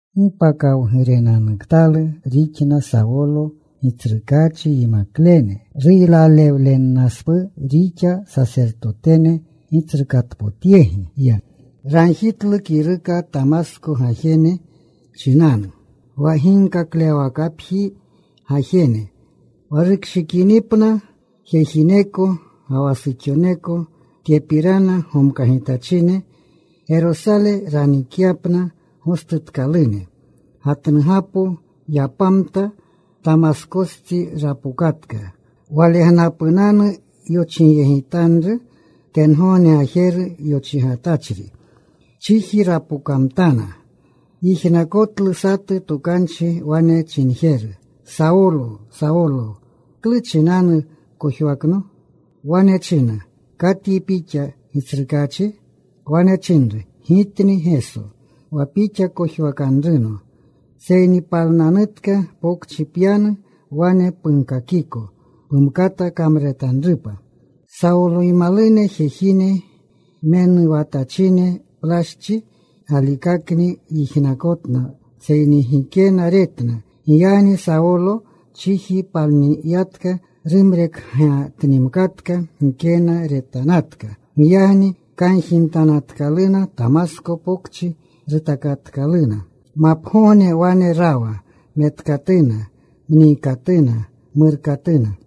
¡Gi pakawgurenanuktalu rixna Sawolo Gitsrukaachi yimaklene! Ruylalewlennaspuu rixa. Sasertotene gitsrukatpotyegi ya. Ragjitlu kiruka Tamasko gajene chinanu, wa ginkaklewawakapji gajene, wa rukshikinipna jejineko ga wa suxoneko tyepirana gomkagitachine Gerosale ranikyapna gostutkalune. Gatnugapo yapamta. Tamaskostsi rapokatka. Walegnapunanu yochigyegitanru tengogne gajeru yochigatachri. Chiji rapokamtana. Yijnakotlu satu tokanchi wane chinjeru, “Sawolo, Sawolo, ¿klu chinanu pkojwakno?” Wane china, “¿Katyi Pixa, Gitsrukaachi?” Wane chinru, “Gitni Geso, wa pixa kojwakanruno. Seyni palnanutka. Pokchi pyanu. Wane punkakiko pumkata kamruretanrupa.” Sawoloymalune jejine menuwatachine. Plaschi galikakni yijnakotna, seyni gikena retna. Giyagni Sawolo chiji palniyatka. Rumrekgatnimkatka. Gikena retanatka. Giyagni kanjimtanatkaluna. Tamasko Pokchi rutakatkaluna. Mapgogne wane rawa. Metkatuna. Mniikatuna. Murkatuna.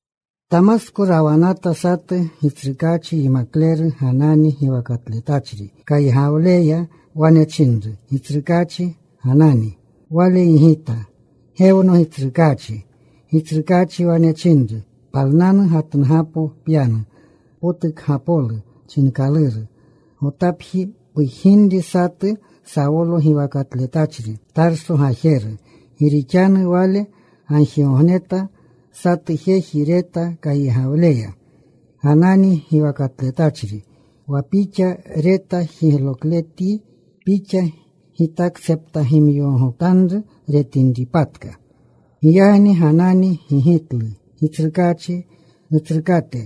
Tamasko rawanata satu Gitsrukaachi yimakleru Ganani giwakatletachri. Kaygawleya wane chinru Gitsrukaachi, “Ganani.” Wale gigita, “Gewno, Gitsrukaachi.” Gitsrukaachi wane chinru, “Palnanu. Gatnugapo pyanu, Potukgapolu chinkaluru. Gotapji pujginri satu Sawolo giwakatletachri, Tarso gajeru. Gi rixanu wale gagjigogneta. Satu jeji reta kaygawleya, Ganani giwakatletachri, wa pixa. Reta jiglokletyi. Pixa gitaktseptagimyogogotanru retinripatka.” Giyagni Ganani gigitlu Gitsrukaachi, “Nutsrukate,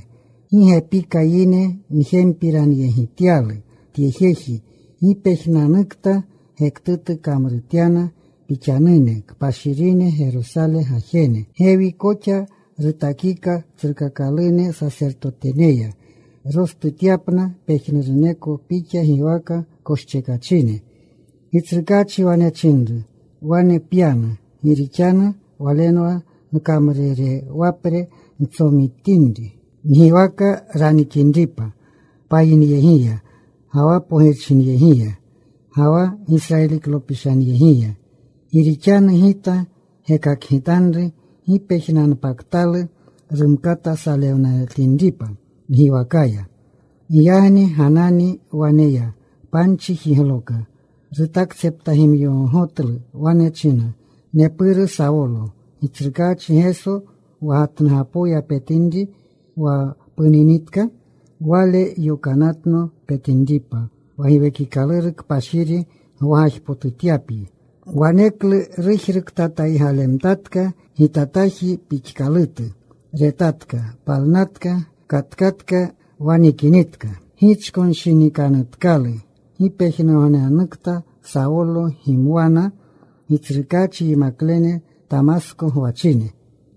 gi gepika yine njempiranyegityalu tye jeji, gi pejnunanukta gektutu kamrutyana Pixanune kpashirine Gerosale gajene. Gewi koxa rutakika tsrukakalune sasertoteneya rostutyapna pejnuruneko Pixa giwaka koschekachine.” Gitsrukaachi wane chinru, “Wane pyanu. Gi rixanu walenwa nkamrurewapre ntsomitinri, ngiwaka ranikinripa payinyegiya, ga wa pogirchinyegiya, ga wa Gisrayiliklopishanyegiya. Gi rixanu Gita gekakgitanru gi pejnunanpaktalu rumkata salewnaletinripa ngiwakaya.” Giyagni Ganani wane ya. Panchi jigloka. Rutaktseptagimyogogotlu. Wane china, “Nepuru Sawolo, Gitsrukaachi Geso, wa gatnugapoya petinri wa puninitka, Wale yokanatno petinripa, wa Giwekikaluru Kpashiri gwagajpotutyapyi.” Waneklu rujruktataygalemtatka gitataji pixkalutu. Retatka. Palnatka. Katkatka. Wa nikinitka gichkonshinikanutkalu. Gi pejnugognekta Sawolo gimwana Gitsrukaachi yimaklene Tamasko gwachine.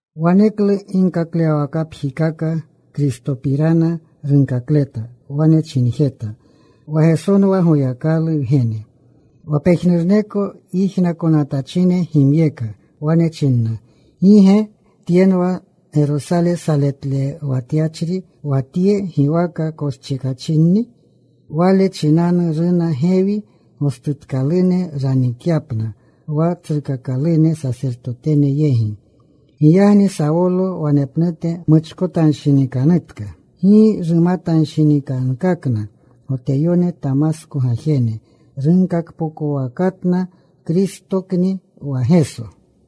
Waneklu ginkaklewawakapjikaka Kristopirana runkakleta. Wane chinjeta wa Gesonwa Goyakalu Wgene. Wa pejnuruneko yijnakonatachine gimyeka. Wane chinna, “¿Gi ge tyenwa Gerosale saletlewatyachri wa tye giwaka koschekachinni? Wale chinanu runa gewi, gostutkalune ranikyapna wa tsrukakalune sasertotene yegi.” Giyagni Sawolo wanepnute muchkotanshinikanutka. Gi rumatanshinikankakna Goteyone Tamasko gajene. Runkakpokowakatna Kristokni wa Geso.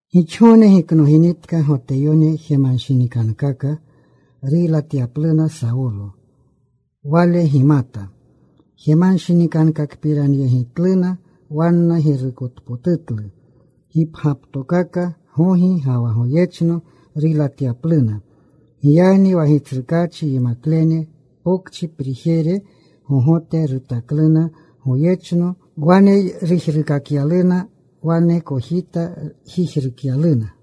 Gixgogne giknoginitka Goteyone jemanshinikankaka ruylatyapluna Sawolo. Wale gimata jemanshinikankakpiranyegitluna. Wanna girukotpotutlu gipgyaptokaka gogi ga wa goyechno ruylatyapluna. Giyagni wa Gitsrukaachi yimaklene pokchi prijere gogote rutakluna goyechno. Wane rujruukakyaluna. Wane kojita jijrukyaluna.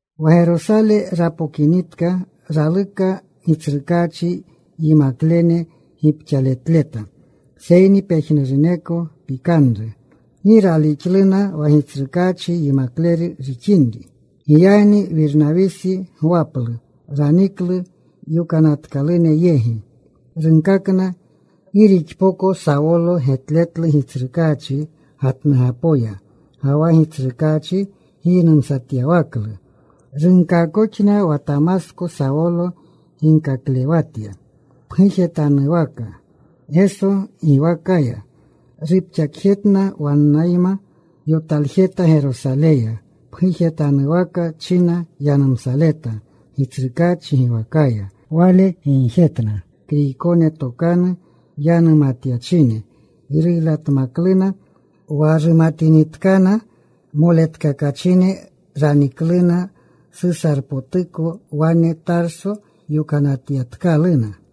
Wa Gerosale rapokinitka raluka Gitsrukaachi yimaklene gipxaletleta. Seyni pejnuruneko pikanru. Gi ralixluna wa Gitsrukaachi yimakleru rixinri. Giyagni Wirnawisi gwaplu. Raniklu yokanatkalune yegi. Runkakna gi rixpoko Sawolo getletlu Gitsrukaachi gatnugapoya, ga wa Gitsrukaachi giynumatyawaklu. Runkaakoxna wa Tamasko Sawolo ginkaklewatya pgujetanuwaka Geso giwakaya. Rupxaletjetna. Wannayma yotaljeta Gerosaleya. Pgujetanuwaka china yanumsaleta Gitsrukaachi giwakaya. Wale gigjetna Kriykone tokanu yanumatyachine. Ruylatmakluna. Wa rumatinitkana moletkakachine ranikluna Susarpotuko. Wane Tarso yokanatyatkaluna.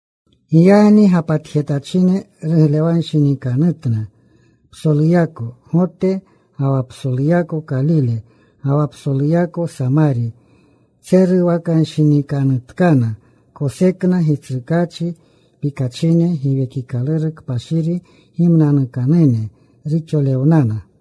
Giyagni gapatjetachine ruglewanshinikanutna psoluyako Gote, ga wa psoluyako Kalile, ga wa psoluyako Samari. Tseruwakanshinikanutkana. Kosekna Gitsrukaachi pikachine. Giwekikaluru Kpashiri gimnanukanune ruxolewnana.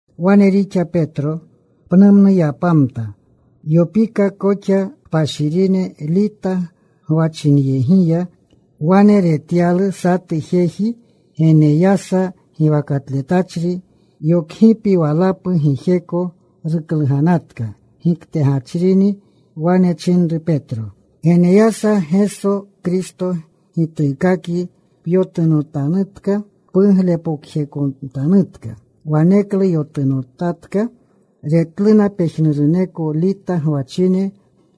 Wane rixa Petro. Pnumnu yapamta. Yopika koxa kpashirine Lita gwachinyegiya. Wane retyalu satu jeji Geneyasa giwakatletachri. Yokgipi walapu gijeko rukluganatka. Giktegachrinni. Wane chinru Petro, “Geneyasa, Geso Kristo gituukakyi. Pyotunotanutka. Puglepokjejekotanutka.” Waneklu yotunotatka. Retluna pejnuruneko Lita gwachine,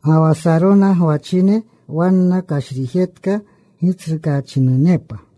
ga wa Sarona gwachine. Wanna kashrijetka. Gitsrukaachinunepa.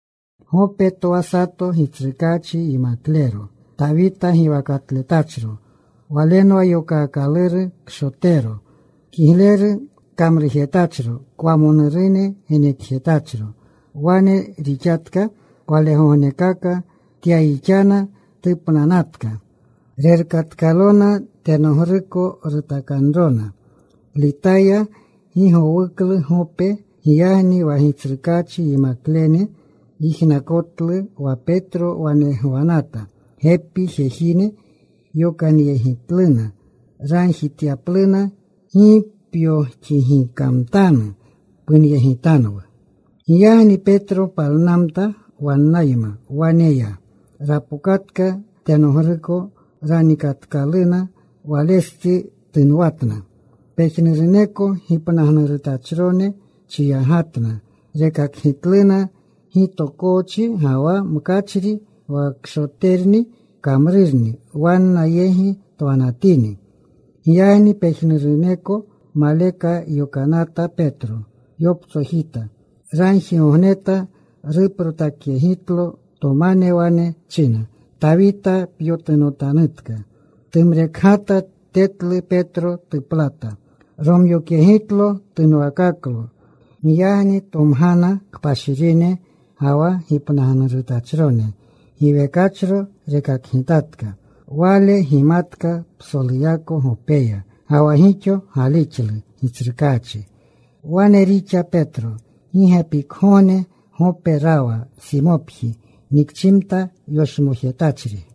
Gope twa sato Gitsrukaachi yimaklero, Tawita giwakatletachro. Walenwa yokaakaluru Kshotero. Kigleru kamrujetachro. Kwamonurune genekjetachro. Wane rixatka walegognekaka. Tyayixana. Tupnanatka. Rerkatkalona. Tenogruko rutakanrona. Litaya gi gowuklu Gope. Giyagni wa Gitsrukaachi yimaklene yijnakotlu wa Petro wane gwanata. Gepi jejine yokanyegitluna. Ragjityapluna, “Gi pyoxigikamtanu. Punyegitanwu.” Giyagni Petro palnamta. Wannayma wane ya. Rapokatka. Tenogruko ranikatkaluna. Walestsi tunwatna pejnuroneko gipnagnurutachrone. Chiyagatna. Rekakgitluna gitokoochi ga wa mkachri wa Kshoterni kamrurni wanna yegi twanatini. Giyagni pejnuruneko maleka yokanata Petro. Yoptsojita. Ragjigogneta. Ruprotakyegitlo tomane. Wane china, “Tawita, pyotunotanutka.” Tumrekgata. Tetlu Petro. Tuplata. Romyokyegitlo. Tunwakaklo. Giyagni tomgana kpashirine ga wa gipnagnurutachrone. Giwekachro rekakgitatka. Wale gimatka psoluyako Gopeya, ga wa gixo galixlu Gitsrukaachi. Wane rixa Petro. Gi gepikgogne Gope rawa Simopji, nikchimta yoshmojetachri.